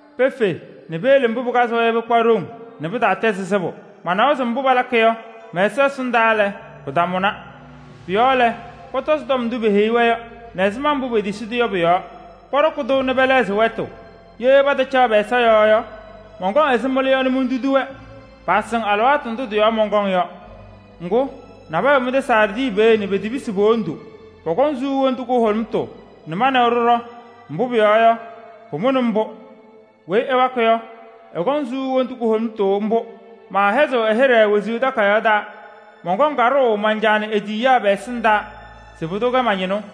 Pefe nɛ peyele mbʋ pɩkazɩ-wɛ yɔ, pɩkpa ɖoŋ nɛ pɩtaatɛzɩ sɩbʋ: manawa se mbʋ palakɩ yɔ, mɛ-Ɛsɔ ɛsɩndaa lɛ, pɩtamʋna. Pʋ-yɔɔ lɛ, pɔtɔzɩ tɔm ndʋ peheyi-wɛ yɔ nɛ ɛzɩma mbʋ petisi-tʋ yɔ pɔ-yɔɔ. Pɔɖɔkɩ-tʋ nɛ pɛlɛɣzɩ wɛtʋ. Ye patacaɣ pɛ-ɛza yɔɔ yɔ, mɔnkɔŋ ɛzɩ mɩlʋ yɔ nɛ montudi-wɛ, paasɩŋ alɩwaatʋ ndʋ tɩ-yɔɔ mɔnkɔŋ yɔ. Pɩtɛ, nabɛyɛ wɛ mɩ-tɛ Saardɩ peeye nɛ petepisi po-wondu. Pɔkɔŋ suu wondu kʋhʋlʋmʋtʋ nɛ ma nɛ wɛ ɖɩɖɔ, mbʋ pʋyɔɔ yɔ, pamʋnɩ mbʋ. ‘Weyi ɛwakɩ yɔ, ɛkɔŋ suu wondu kʋhʋlʋmʋtʋ mbʋ. Maahɩzɩɣ ɛ-hɩɖɛ wezuu takayaɣ taa. Mɔnkɔŋ kaɖʋʋ man-Caa nɛ e-tiyiyaa pɛ-ɛsɩndaa se pʋdʋ kɛ ma-ñɩnʋ.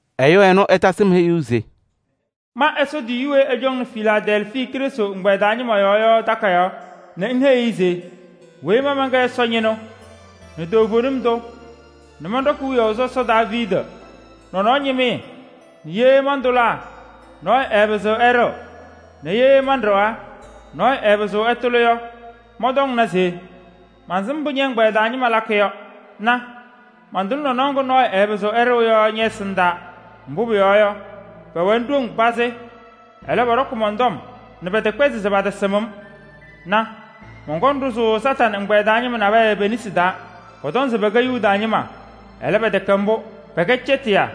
Ɛyʋ ɛnʋ ɛtasɩ-m heyuu se: “Ma Ɛsɔ tiyiyu weyi ɛcɔŋnɩ Filaadɛlfii Krɩstʋ ɛgbɛyɛ taa ñɩma yɔɔ yɔ takayaɣ nɛ ŋheyi-i se: ‘Weyi ma mɛnkɛ Ɛsɔ ñɩnʋ nɛ toovenim tʋ nɛ mɔnɖɔkɩ wiyaʋ sɔsɔ Daaviidi nɔnɔɔ ñɩmɩyɛ nɛ ye mantʋlaa, nɔɔyʋ ɛɛpɩzɩɣ ɛɖɩɣ nɛ ye manɖɩɣaa, nɔɔyʋ ɛɛpɩzɩɣ ɛtʋlɩ yɔ, mɔntɔŋna se: mansɩm mbʋ ñɛ-ɛgbɛyɛ taa ñɩma lakɩ yɔ. Na: mantʋlɩ nɔnɔɔ ŋga nɔɔyʋ ɛɛpɩzɩɣ ɛɖɩɣ yɔ ñɛ-ɛsɩndaa. Mbʋ pʋyɔɔ yɔ, pɛwɛnɩ ɖoŋ pazɩ, ɛlɛ, pɔɖɔkɩ mɔn-tɔm nɛ pɛtɛkpɛzɩ se patasɩm-m. Na! Mɔnkɔŋ ɖʋzʋʋ Kañadʋ Satanɩ ɛgbɛyɛ taa ñɩma nabɛyɛ pe-nesi taa. Pɔtɔŋ se pɛkɛ Yuda ñɩma, ɛlɛ, pɛtɛkɛ mbʋ, pɛkɛ cɛtɩyaa.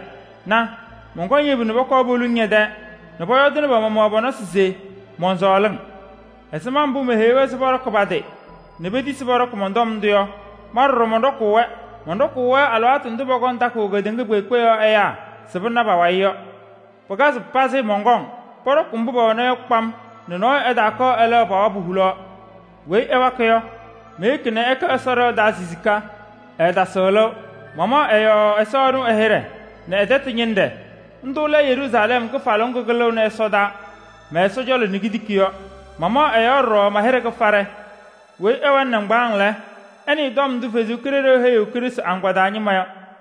Na! Mɔnkɔŋ yebu nɛ pɔkɔɔ poluŋ pɛ-tɛɛ nɛ pɔyɔɔdɩnɩ pɔ-nɔsɩ se mɔnsɔɔlɩ-wɛ. Ɛzɩma mbʋ meheyi-wɛ se pɔɖɔkɩ pa-tɩ nɛ petisi pɔɖɔkɩ tɔm ndʋ yɔ, ma ɖɔɖɔ mɔnɖɔkʋʋ-wɛ. Mɔnɖɔkʋʋ-wɛ alɩwaatʋ ndʋ pʋkɔŋ takʋʋ kedeŋa kpeekpe yɔɔ ɛyaa se pɩna pa-wayɩ yɔ. Pɩkazɩ pazɩ, mɔnkɔŋ. Pɔɖɔkɩ mbʋ pɛwɛna yɔ kpam nɛ nɔɔyʋ ɛtaakɔɔ ɛlɛɣ pa-wabʋ hulaɣ. ‘Weyi ɛwakɩ yɔ, meyeki nɛ ɛkɛ mɛ-Ɛsɔ ɖɩɣa taa sisika, ɛɛtasɩɣ lɩʋ. Mamaɣ ɛ-yɔɔ mɛ-Ɛsɔ ɛnʋ ɛ-hɩɖɛ nɛ ɛ-tɛtʋ ñɩnɖɛ: ndʋʋ lɛ Yeruusalɛm kɩfalʋʋ ŋgʋ kɩlɩɣnɩ ɛsɔdaa mɛ-Ɛsɔ cɔlɔ nɛ kitiki yɔ. Mamaɣ ɛ-yɔɔ ɖɔɖɔ ma-hɩɖɛ kɩfaɖɛ. ‘Weyi ɛwɛnɩ nɩŋgbaaŋ lɛ, ɛnɩɩ tɔm ndʋ Ɛsɔ Kalɩzaɣ heyiɣ Krɩstʋ agbaa taa ñɩma yɔ!’”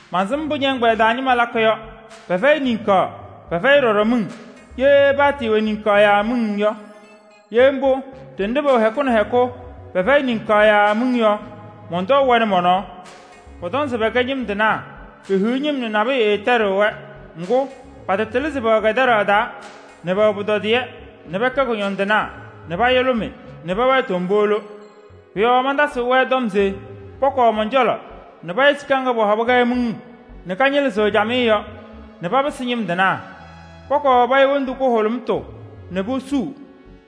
mansɩm mbʋ ñɛ-ɛgbɛyɛ taa ñɩma lakɩ yɔ: pɛfɛyɩ niŋkaɣ, pɛfɛyɩ ɖɔɖɔ miŋ. Ye paatɩɩwɛ niŋkaɣ yaa miŋ yɔ! Ye mbʋ, ɖenɖe pɛwɛ hɛkʋ nɛ hɛkʋ, pɛfɛyɩ niŋkaɣ yaa pɛfɛyɩ miŋ yɔ, mɔntɔʋ-wɛ nɛ mɔ-nɔɔ. Pɔtɔŋ se pɛkɛ ñɩm tɩnaa, pehiɣ ñɩm nɛ nabʋyʋ ɛɛtɛɖɩɣ-wɛ. Ŋgʋ, patatɩlɩ se pɛwɛ kɛtɛɖaɣ taa nɛ pɛwɛɛ pʋtɔdɩyɛ nɛ pɛkɛ kʋñɔndɩnaa nɛ payʋlʋmɩ nɛ pɛwɛɛ tombolo. Pʋ-yɔɔ mantasɩɣ-wɛ tɔm se pɔkɔɔ mɔn-cɔlɔ nɛ paya sika ŋga pɔhɔbɩ-kɛ miŋ nɛ kañɩlɩzɩɣ camɩyɛ yɔ nɛ papɩsɩ ñɩm tɩnaa. Pɔkɔɔ paya wondu kʋhʋlʋmʋtʋ nɛ posuu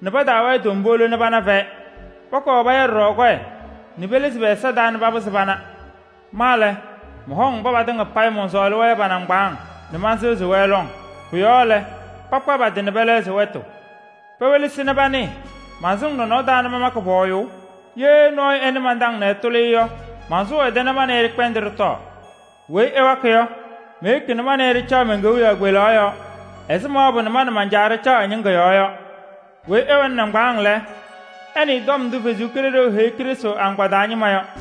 nɛ pataawɛɛ tombolo nɛ pana pɛ-fɛyɛ. Pɔkɔɔ paya ɖɔɖɔ kɔyɛ nɛ pelizi pɛ-ɛza taa nɛ papɩzɩ pana. Ma lɛ, mɔhɔŋ mba patɩŋa payɩ mɔnsɔɔlɩ-wɛ yɔ pa-nɩŋgbaaŋ nɛ mansɩɣzɩ-wɛ lɔŋ. Pʋ-yɔɔ lɛ, pakpa pa-tɩ nɛ pɛlɛɣzɩ wɛtʋ. Pewelesi nɛ panɩɩ: mansɩŋ nɔnɔɔ taa nɛ mamakɩ pɔɔyʋʋ. Ye nɔɔyʋ ɛnɩ man-taŋ nɛ ɛtʋlɩ yɔ, mansʋʋ ɛ-tɛ nɛ ma nɛ ɩ ɖɩkpɛndɩ ɖɩtɔɔ. ‘Weyi ɛwakɩ yɔ, meyeki nɛ ma nɛ ɩ ɖɩcaɣ men-kewiyaɣ kpelaɣ yɔɔ ɛzɩ ma mawabʋ nɛ ma nɛ man-Caa ɖɩcaɣ ɛ-ñɩŋga yɔɔ yɔ. ‘Weyi ɛwɛnɩ nɩŋgbaaŋ lɛ, ɛnɩɩ tɔm ndʋ Ɛsɔ Kalɩzaɣ heyiɣ Krɩstʋ agbaa taa ñɩma yɔ!’”